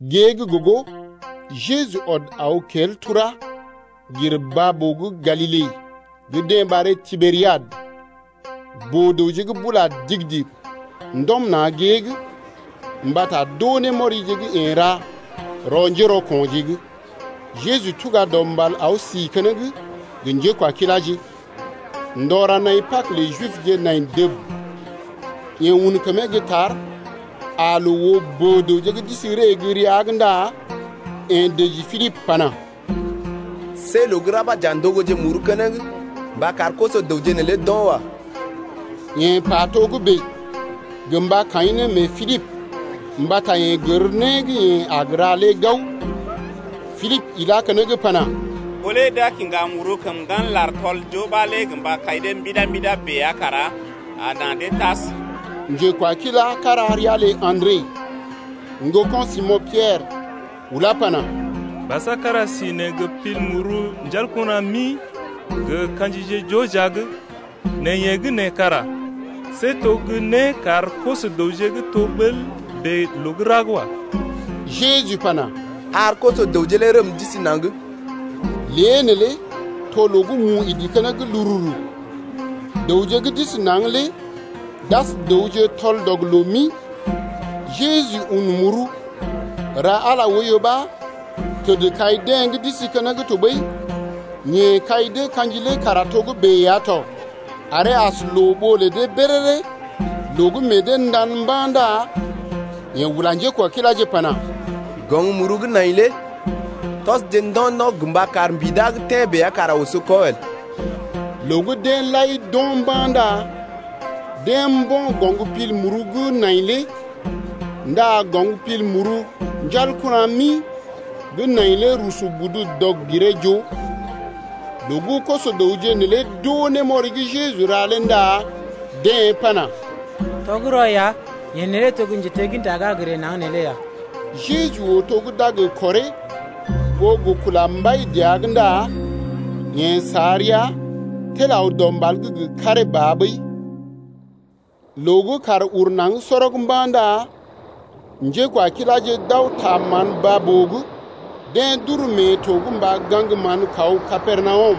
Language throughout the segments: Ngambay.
Gée gə́ gogo Jeju ɔd aw kel tura gir baa-boo gə́ Galile gə́ deḛ ɓaree Tiberiad. Boo-dəwje gə́ bula digi-digi ndɔm na̰ gée’g mbata d’oo némɔrije gə́ yeḛ ra rɔ njérɔko̰je’g. Jeju tuga dɔ mbal aw si keneŋ gə njékwakiláje. Ndɔ ra naḭ Pag lə Jibje nai dəb. Yeḛ un kəmee gə́ tar aa loo oo boo-dəwje gə́ d’isi ree gə́ rəa’g ndá yeḛ dəji Pilibə pana: See loo gə́ ra ɓa j’a ndogoje muru keneŋ mba kar koso-dəwje neelé d’o̰ wa. Yeḛ pa togə́bè gə mba kaḭ ne mee Pilibə mbata yeḛ gər né gə́ yeḛ a gə ra lé gao. Pilibə ilá keneŋ pana: Ɓó lé d’a kiŋga muru kəm ŋgan lar tɔl-joo ɓa lé gə mba kai dee mbida-mbida bèe ya kara a na dee tas. Njekwakilá kára ria lə Andre, ŋgoko̰ Simo̰ Piɛrə ulá pana: Basa kára si nee gə pil muru ɔrj mi gə ka̰jije joo jia’g, nɛ yeḛ gə́ nee kara see to gə́ né kar koso-dəwje gə́ to ɓəl bèe loo gə́ ra’g wa. Jeju pana: Ar koso-dəwje lé rəm d’isi naŋg. Lée neelé to loo gə́ mu idi keneŋ lururu. Dəwje gə́ d’isi naŋg lé d’as dəwje tɔl-dɔg-loo-mi. Jeju un muru, ra Ala lé oiyo ɓa təd kai deḛ gə́ d’isi keneŋ tɔɓəi yeḛ kai dee ka̰ji lé kara togə́bè ya tɔ, aree as loo ɓoo lə dee béréré. Loo gə́ meḛ dee ndan mba̰ ndá yeḛ ula njékwakiláje pana: Gɔŋ muru gə́ nai lé tɔsje ndo̰-ndo̰ gə mba kar mbida gə́ tḛ́ bèe ya kara oso kɔ el. Loo gə́ deḛ lai d’o̰ mba̰ ndá deḛ mbo̰ goŋ muru gə́ nai lé ndá goŋ muru ɔrj mi gə́ nai lé rusu budu dɔg-giree-joo. Loo gə́ koso-dəwje neelé d’oo némɔri gə́ Jeju ra lé ndá deḛ pana: Tɔgərɔ ya, yeḛ neelé to gə́ njetegginta gə́ a gə ree naŋg neelé ya. Jeju oo to gə́ d’a gə kɔree ɓó gə kula mbai dəa’g ndá yeḛ sa rəa tel aw dɔ mbal’g gə karee ba ɓəi. Loo gə́ kàr uru naŋg sɔrɔg mba̰ ndá njékwakiláje d’aw ta mán baa-boo’g. Deḛ d’uru mee to’g mba gaŋg mán kaw gə́ Kapernawum.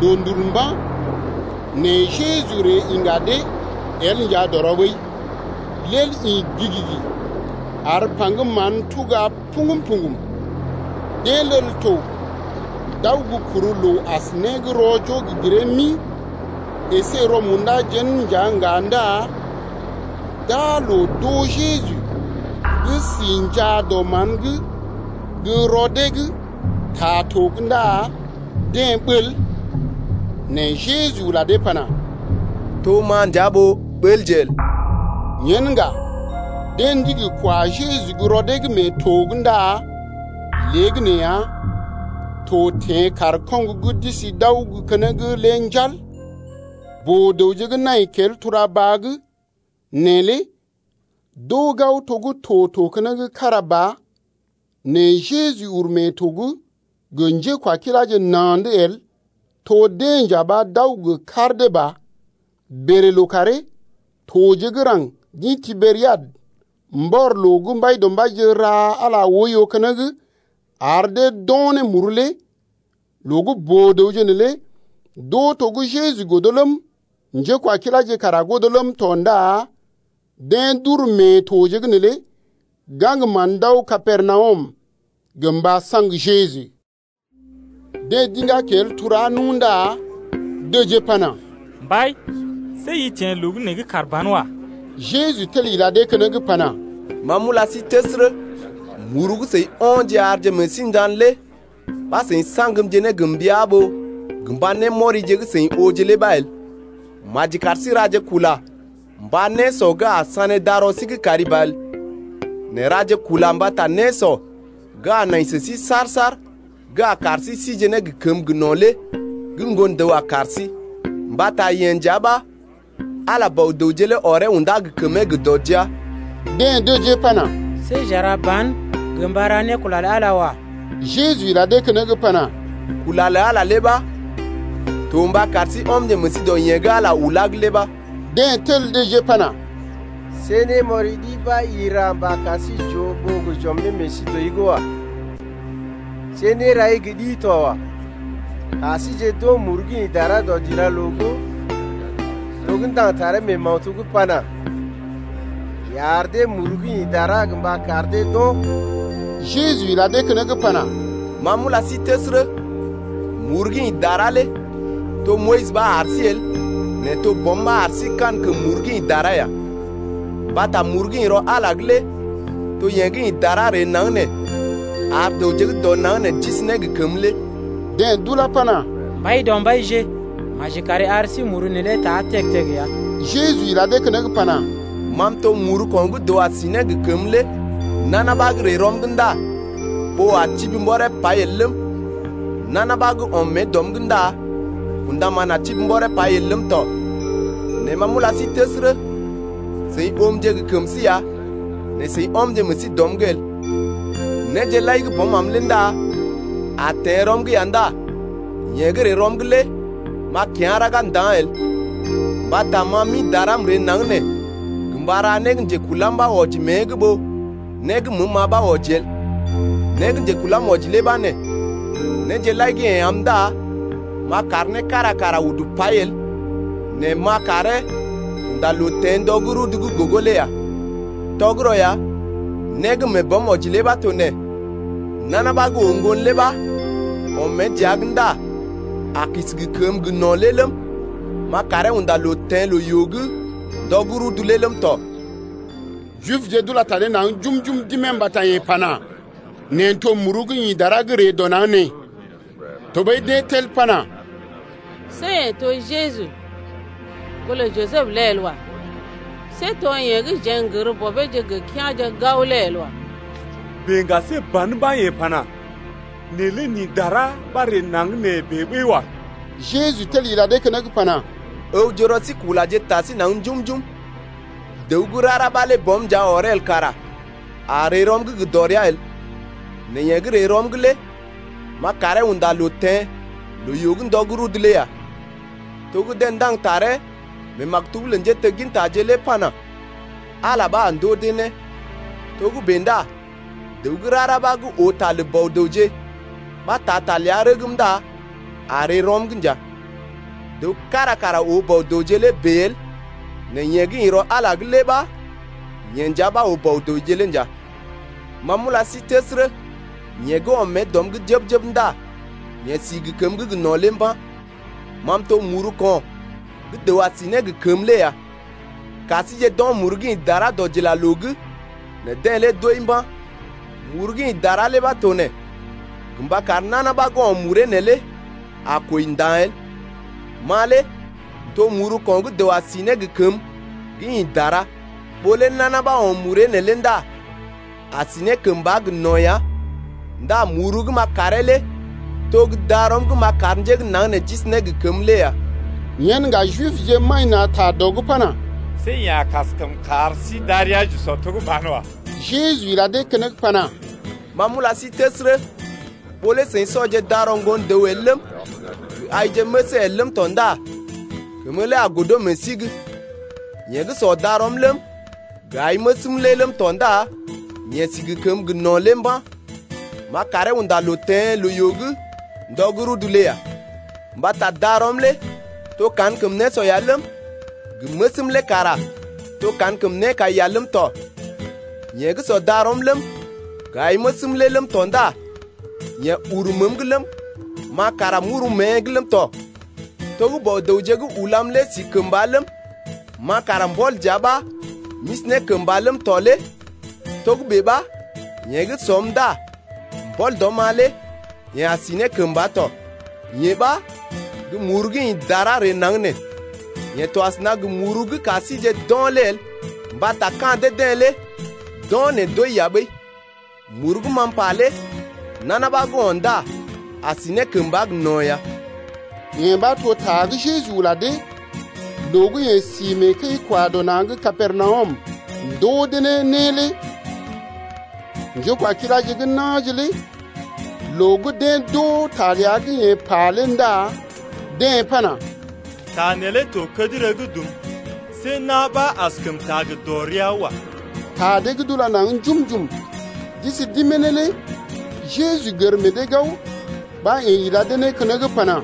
Loondul mba̰, nɛ Jeju ree iŋga dee el nja dɔrɔ ɓəi. Lel ḭ gigigi ar paŋgəm mán tuga poŋgm-poŋgm. Deḛ lel to d’aw gə kuru loo as gə́ né gə́ rɔ-joo-giree-mi əsé rɔ-munda jén nja ŋga ndá d’aa loo d’oo Jeju gə́ si njaa dɔ mán’g gə́ rɔ dee’g ta to’g ndá deḛ ɓəl. Nɛ Jeju ula dee pana: To ma nja ɓó ɓəlje el. Yen ŋga deḛ ndigi kwa Jeju gə́ rɔ dee’g mee to’g ndá léegəneeya to teḛ kaar koŋgo gə́ d’isi d’aw gə́ keneŋ lé njal. Boo-dəwje gə́ nai kel tura-baa gə́ nee lé d’oo gao to gə́ to to keneŋ kára ba nɛ Jeju uru mee to’g gə njékwakiláje na̰’d el, to deḛ nja ɓa d’aw gə kar dee ba. Bèlè lookàree toje gə́ raŋg d’ḭ Tiberiad mbɔr loo gə́ Mbaidɔmbaije ra Ala oiyo keneŋ ar dee d’o̰ ne muru lé. Loo gə́ boo-dəwje neelé d’oo to gə́ Jeju godo ləm, njékwakiláje kara godo ləm tɔ ndá deḛ d’uru mee toje’g neelé gaŋg mán d’aw Kapernawum gə mba saŋg Jeju. Deḛ d’iŋgá kel turá nu ndá dəjee pana: Mbai see i teḛ loo gə́ nee’g kàr ban wa. Jeju tel ila dee keneŋ pana: Ma m’ula sí təsərə, muru gə́ seḭ o̰je arje meḛ sí ndan lé ɓa seḭ saŋgmje ne gə mbəa ɓó gə mba némɔrije gə́ seḭ ooje lé ɓa el. Maji kar sí raje kula mba nésɔ gə́ a sané darɔ sí’g kari ba el. Nɛ raje kula mbata nésɔ gə́ a nai sə sí saar-saar gə́ a kar sí sije ne gə kəməgə́ gə no̰ lé gə́ Ŋgon-dəw a kar sí lé ya. Mbata yeḛ nja ɓa Ala Bɔ-dəwje lé ɔree unda gə kəmee gə dɔ jia. Deḛ dəjee pana: See j’a ra ban gə mba ra ne kula lə Ala lé wa. Jeju ila dee keneŋ pana: Kula lə Ala lé ɓa to mba kar sí ɔmje meḛ sí dɔ yeḛ gə́ Ala ulá’g lé ɓa. Deḛ tel dəjee pana: See némɔri ɗi ɓa i ra mba kar sí j’ooje ɓó gə j’ɔmje ne meḛ sí dɔi’g wa. See nérai gə́ ɗi to wa. Ka síjeḛ d’o̰ muru gə́ ḭ dara dɔdilaloo’g to gə́ ndaŋg ne taree mee maktub’g pana: Yeḛ ar dee muru gə́ ḭ dara gə mba kar dee d’o̰. Jeju ila dee keneŋ pana: Ma m’ula sí təsərə, muru gə́ ḭ dara lé to Moyis ɓa ar sí el nɛ to Bɔm ɓa ar sí kankəm muru gə́ ḭ dara ya. Mbata muru gə́ ḭ rɔ Ala’g lé to yee gə́ ḭ dara ree naŋg nee ar dəwje gə́ dɔ naŋg nee d’isi ne gə kəmə lé. Deḛ d’ulá pana: Mbaidɔmbaije, maji kari ar sí muru neelé ta teg-teg ya. Jeju ila dee keneŋ pana: Ma m’to muru ko̰ gə́ dəw a si ne gə kəmə lé. Nana ɓa gə́ ree rɔm’g ndá ɓoo a tibi mbɔree pai el ləm, nana ɓa gə́ ɔm mée dɔm’g ndá kṵdaman a tibi mbɔree pai el ləm tɔ. Nɛ ma m’ula sí təsərə, seḭ oomje gə kəm sí ya nɛ seḭ ɔmje meḛ sí dɔm’g el. Néje lai gə́ Bɔm am lé ndá a teḛ rɔm’g ya ndá yeḛ gə́ ree rɔm’g lé m’a kyá̰ raga nda̰ el. Mbata ma m’ḭ dara m’ree naŋg nee gə mba ra né gə́ njekulam ɓa wɔji mée’g ɓó né gə́ məəm-ma ɓa wɔji el. Né gə́ njekulam wɔji lé ɓa nee: Néje lai gə́ yeḛ am ndá m’a kar né kára kara udu pai el nɛ m’a karee unda loo teḛ ndɔ gə́ rudu gə́ gogo lé ya. Tɔgərɔ ya, né gə́ mee Bɔm wɔji lé ɓa to nee: Nana ɓa gə́ oo Ŋgon lé ɓa ɔm mée dəa’g ndá a si gə kəməgə́ gə no̰ lé ləm, m’a karee unda loo teḛ loo-yoo’g ndɔ gə́ rudu’g lé ləm tɔ. Jibje d’ula ta dee naŋg njum-njum d’imee mbata yeḛ pana: Neḛ n’to muru gə́ ḭ dara gə́ n’ree dɔ naŋg nee. Tɔɓəi deḛ tel pana: See yeḛ to Jeju, ŋgolə Jisəb lé el wa. See to yeḛ gə́ jeḛ n’gər bɔbeeje gə kea̰je gao lé el wa. Bèe ŋga see ban ɓa yeḛ pana: Neḛ lé n’ḭ dara ɓa n’ree naŋg bèe ɓəi wa. Jeju tel ila dee keneŋ pana: Ǝwje rɔ sí kulaje ta sí naŋg njum-njum. Dəw gə́ rara ɓa lé Bɔm nja ɔree el kara a ree rɔm’g gə dɔrea el, nɛ yeḛ gə́ ree rɔm’g lé m’a karee unda loo teḛ loo-yoo’g ndɔ gə́ rudu’g lé ya. To gə́ deḛ ndaŋg taree mee maktub gə́ lə njéteggintaje’g lé pana: Ala ɓa a ndoo dee né. Togə́bè ndá dəw gə́ rara ɓa gə́ oo ta lə Bɔ-dəwje ɓa taa ta ləa rəgm ndá a ree rɔm’g nja. Dəw kára kara oo Bɔ-dəwje lé bèe el nɛ yeḛ gə́ ḭ rɔ Ala’g lé ɓa, yeḛ nja ɓa oo Bɔ-dəwje lé nja. Ma m’ula sí təsərə, yeḛ gə́ ɔm mée dɔm’g jəb-jəb ndá yeḛ si gə kəmə gə́ gə no̰ lé mba̰. Ma m’to muru ko̰ gə́ dəw a si ne gə kəmə lé ya. Ka síje d’o̰ muru gə́ ḭ dara dɔdilaloo’g nɛ deḛ lé d’wəi mba̰. Muru gə́ ḭ dara lé ɓa to nee: Gə mba kar nana ɓa gə́ o̰ muree neelé a kwəi nda̰ el. Ma lé m’to muru ko̰ gə́ dəw a si ne gə kəmə gə́ ḭ dara lé. Ɓó lé nana ɓa o̰ muree neelé ndá a si ne kəmba gə no̰ ya ndá muru gə́ m’a karee lé to gə́ darɔm gə́ m’a kar njé gə́ naŋg nee d’isi ne gə kəmə lé ya. Yen ŋga Jibje maḭ na̰ ta dɔ’g pana: See yeḛ a kaskəm kar sí darəa j’usɔ to gə́ banwa. Jeju ila dee keneŋ pana: Ma m’ula sí təsərə, ɓó lé seḭ sɔje darɔ Ŋgon-dəw el ləm, gə aije məsee el ləm tɔ ndá kəmə lé a godo meḛ sí’g. Yeḛ gə́ sɔ darɔm ləm, gə ai məsm lé ləm tɔ ndá yeḛ si gə kəməgə́ gə no̰ lé mba̰, m’a karee unda loo teḛ loo-yoo’g ndɔ gə́ rudu’g lé ya. Mbata darɔm lé to kankəm nésɔ ya ləm, gə məsm lé kara to kankəm nékai ya ləm tɔ. Yeḛ gə́ sɔ darɔm ləm, gə ai məsm lé ləm tɔ ndá yeḛ uru məəm’g ləm, ma kara m’uru mée’g ləm tɔ. To gə́ Bɔ-dəwje gə́ ulam lé si kəmba ləm, ma kara mbɔl dəa ɓa m’isi ne kəmba ləm tɔ lé togə́bè ɓa yeḛ gə́ sɔm ndá mbɔl dɔm-ma lé yeḛ a si ne kəmba tɔ. Yee ɓa gə́ muru gə́ ḭ dara ree naŋg nee. Yee to asəna gə muru gə́ ka síje d’o̰ lé el mbata ka̰ dee-deḛ lé d’o̰, nɛ d’wəi ya ɓəi. Muru gə́ ma m’pa lé nana ɓa gə́ o̰ ndá a si ne kəmba gə no̰ ya. Yee ɓa to ta gə́ Jeju ula dee loo gə́ yeḛ si mee kəi-kwa-dɔ-na̰ gə́ Kapernawum ndoo dee ne né lé. Njékwakiláje gə́ na̰je lé loo gə́ deḛ d’oo ta ləa gə́ yeḛ pa lé ndá deḛ pana: Ta neelé to kədərə yaa̰, see na̰ ɓa askəm taa gə dɔrea wa. Ta dee gə́ d’ula naŋg njum-njum d’isi d’imee ne lé Jeju gər meḛ dee gao ɓa yeḛ ila dee ne keneŋ pana: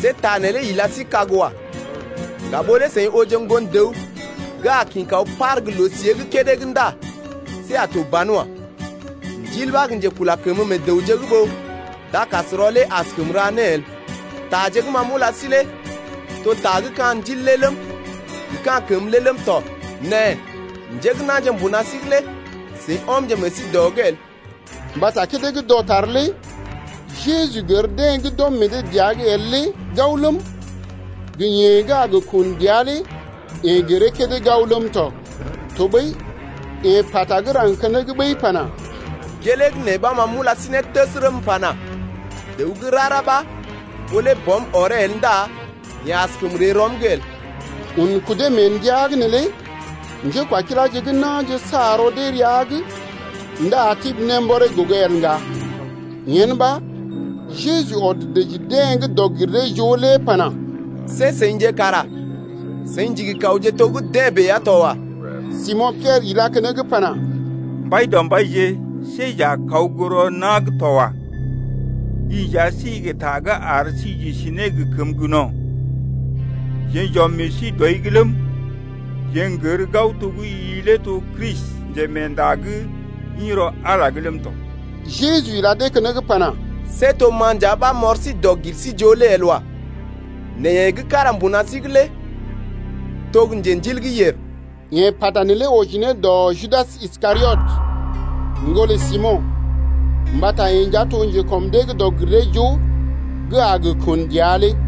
See ta neelé ila sí kag wa. Ŋga ɓó lé seḭ ooje Ŋgon-dəw gə́ a kḭ kaw par gə́ loo-siée gə́ kédé’g ndá see a to banwa. Ndil ɓa gə́ njekula kəmə meḛ dəwje’g ɓó dakasrɔ lé askəm ra né el. Taje gə́ ma m’ula sí lé to ta gə́ ka̰ ndil lé ləm, gə ka̰ kəmə lé ləm tɔ. Nɛ njé gə́ na̰je mbuna sí’g lé seḭ ɔmje meḛ sí dɔ’g el. Mbata kédé gə́ dɔtar lé Jeju gər deḛ gə́ d’ɔm meḛ dee dəa’g el lé gao ləm, gə yeḛ gə́ a gə kun dəa lé yeḛ gəree kédé gao ləm tɔ. Tɔɓəi yeḛ pata gə́ raŋg keneŋ ɓəi pana: Gelee gə́ nee ɓa ma m’ula sí ne təsərə m’pana: Dəw gə́ rara ɓa ɓó lé Bɔm ɔree el ndá yeḛ askəm ree rɔm’g el lé. Un kudee mee ndəa’g neelé njékwakiláje gə́ na̰je sa rɔ dee rəa’g ndá tibi ne mbɔree gogo el ŋga. Yen ɓa Jeju ɔd dəji deḛ gə́ dɔg-gir-dee-joo lé pana: See seḭje kara seḭ ndigi kawje to gə́ deḛ bèe ya to wa. Simo̰ Piɛrə ilá keneŋ pana: Mbaidɔmbaije, see jeḛ j’a kawje gə́ rɔ na̰’g to wa. I nja si gə ta gə́ ar sí j’isi ne gə kəməgə́ gə no̰ lé. Jeḛ j’ɔmje meḛ sí dɔi’g ləm, jeḛ n’gərje gao to gə́ i lé to Kristi, Njemeenda gə́ ḭ rɔ Ala’g lé ləm tɔ. Jeju ila dee keneŋ pana: See to ma nja ɓa m’ɔr sí dɔg-gir-sí-joo lé el wa. Nɛ yeḛ gə́ kára mbuna sí’g lé to gə́ njendil gə́ yèr. Yeḛ pata neelé wɔji ne dɔ Judas Iskariot, ŋgolə Simo̰, mbata yeḛ nja to gə́ njekɔm dee’g dɔg-gir-dee-joo gə́ a gə kun dəa lé.